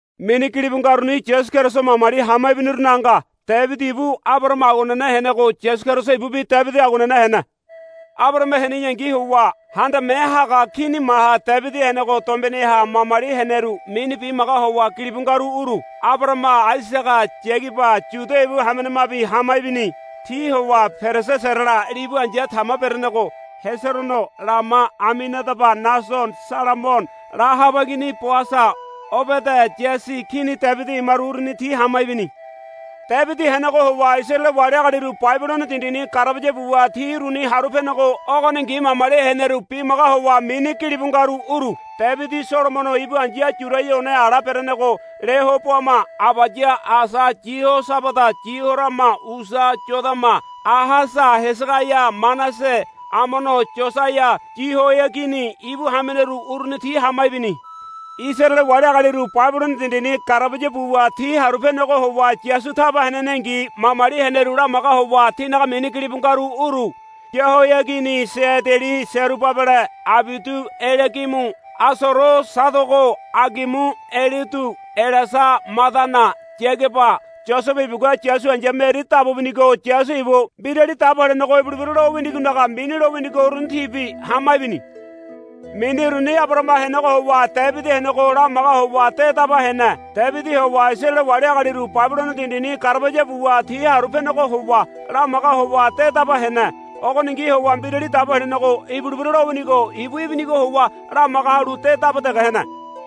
Mini gilibu ngaruni Yasu Keriso mamali hama ibinirunaga nga. Debidi ibu Abarahama aguanene henego Yasu Keriso ibubi Debidi aguanene hene. Abarahama heneyangi howa handame haga kini maha Debidi henego dombeneha mamali heneru mini bimaga howa gilibu ngaru uru. Abarahama Aisaga Yagaba Yuda ibu hamenemabi hama ibini. Ti howa Perese Serala libu ai̱ya Tama berenego Heserono Lama Aminadaba Nasono Salamono Lahaba igini Boasa Obede Yasi Kini Debidi imaru uruni ti hama ibini. Debidi henego howa Isaraele wali agaliru Babilono dindini garabaya buwa ti uruni haru penego ogoningi mamali heneru bimaga howa mini gilibu ngaru uru. Debidi Solomono ibu ai̱ya Yuraia one ala berenego Lehoboama Abaya Asa Yihosabada Yihorama Usia Yodama Ahasa Hesegaia Manase Amono Yosaia Yahoiagini ibu hameneru uruni ti hama ibini. Isaraele wali agaliru Babilono dindini garabaya buwa ti haru penego howa Yasu taba henenengi mamali heneru lamaga howa tinaga mini gilibu ngaru uru. Yahoiagini Seadeli Serubabele Abiudu Eliagimu Asoro Sadogo Agimu Eliudu Eleasa Madana Yagaba Yosebe ibugua Yasu ai̱ya Meri dabu binigo Yasu ibu Mbirali Dabo Helenego ibulebira lowinigonaga mini winigo uruni tibi hama ibini. Mini uruni Abarahama henego howa Debidi henego lamaga howa de daba hene. Debidi howa Isaraele wali agaliru Babilono dindini garabaya buwa ti haru penego howa lamaga howa de daba hene. Ogoningi howa Mbirali Dabo Helenego ibulebira lowinigo ibu ibinigo howa lamaga halu de daba dege hene.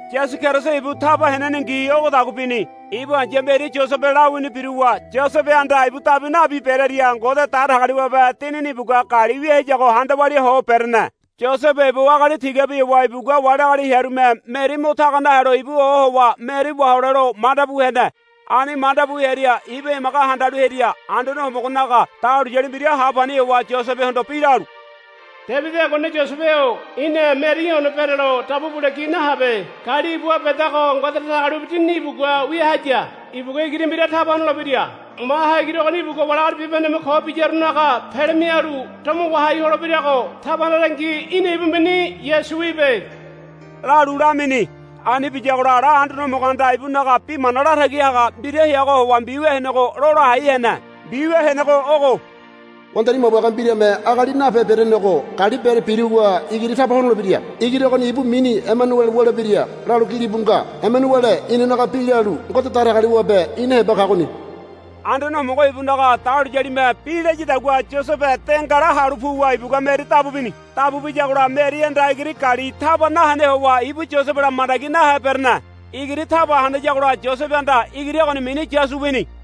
Yasu Keriso ibu taba henenengi ogodagua bini. Ibu ai̱ya Meri Yosebe lawini biruwa Yosebehanda ibu dabu nabi berearia Ngode Datagali wabe Dinini ibugua gali wia hayago handa walia ho berene. Yosebe ibu agali tigabi howa ibugua wali agali hearume Meri mo taga nahelo ibu ohowa Meri wahole lo manda bu hene. Ani manda bu hearia ibu emaga handalu hearia Anduane Homogonaga dahuliyali mbira ha pani howa Yosebehondo bi lalu, Debidi aguanene Yosebe-o í̠na Meri í̠ one berelo dabu bule gi nahabe. Gali ibuha bedago Ngode Datagali wabe Dinini ibugua wia haya. Ibugua igiri mbira taba honolebira. Maha igiri ogoni ibugua wali agali bibahendeme ko biyarunaga pele mialu domo wahai holebirago taba hanarangi í̠na ibu mini Yasu wibe, lalu lamini. Ani biyagola ala Anduane Homogohanda ibunaga bi mana latagi haga mbira heagoha howa mbiwia henego lola hai hene. Mbiwia henego ogo, Wandari mabuage mbirame agali nape berenego gali bere biruwa igiri taba honolebira. Igiri ogoni ibu mini Emanuele wulebira, lalu gilibu nga. Emanuele inanaga bi lalu, Ngode Datagali wabe ina heba kagoni. Anduane Homogo ibunaga dahuliyalime bi layadagua Yosebe de ngala halu puwa ibugua Meri dabu bini. Dabu biyagola Merihanda igiri gali taba nahene howa ibu Yosebela mandagi nahe berene. Igiri taba hanayagola Yosebehanda igiri ogoni mini Yasu wini.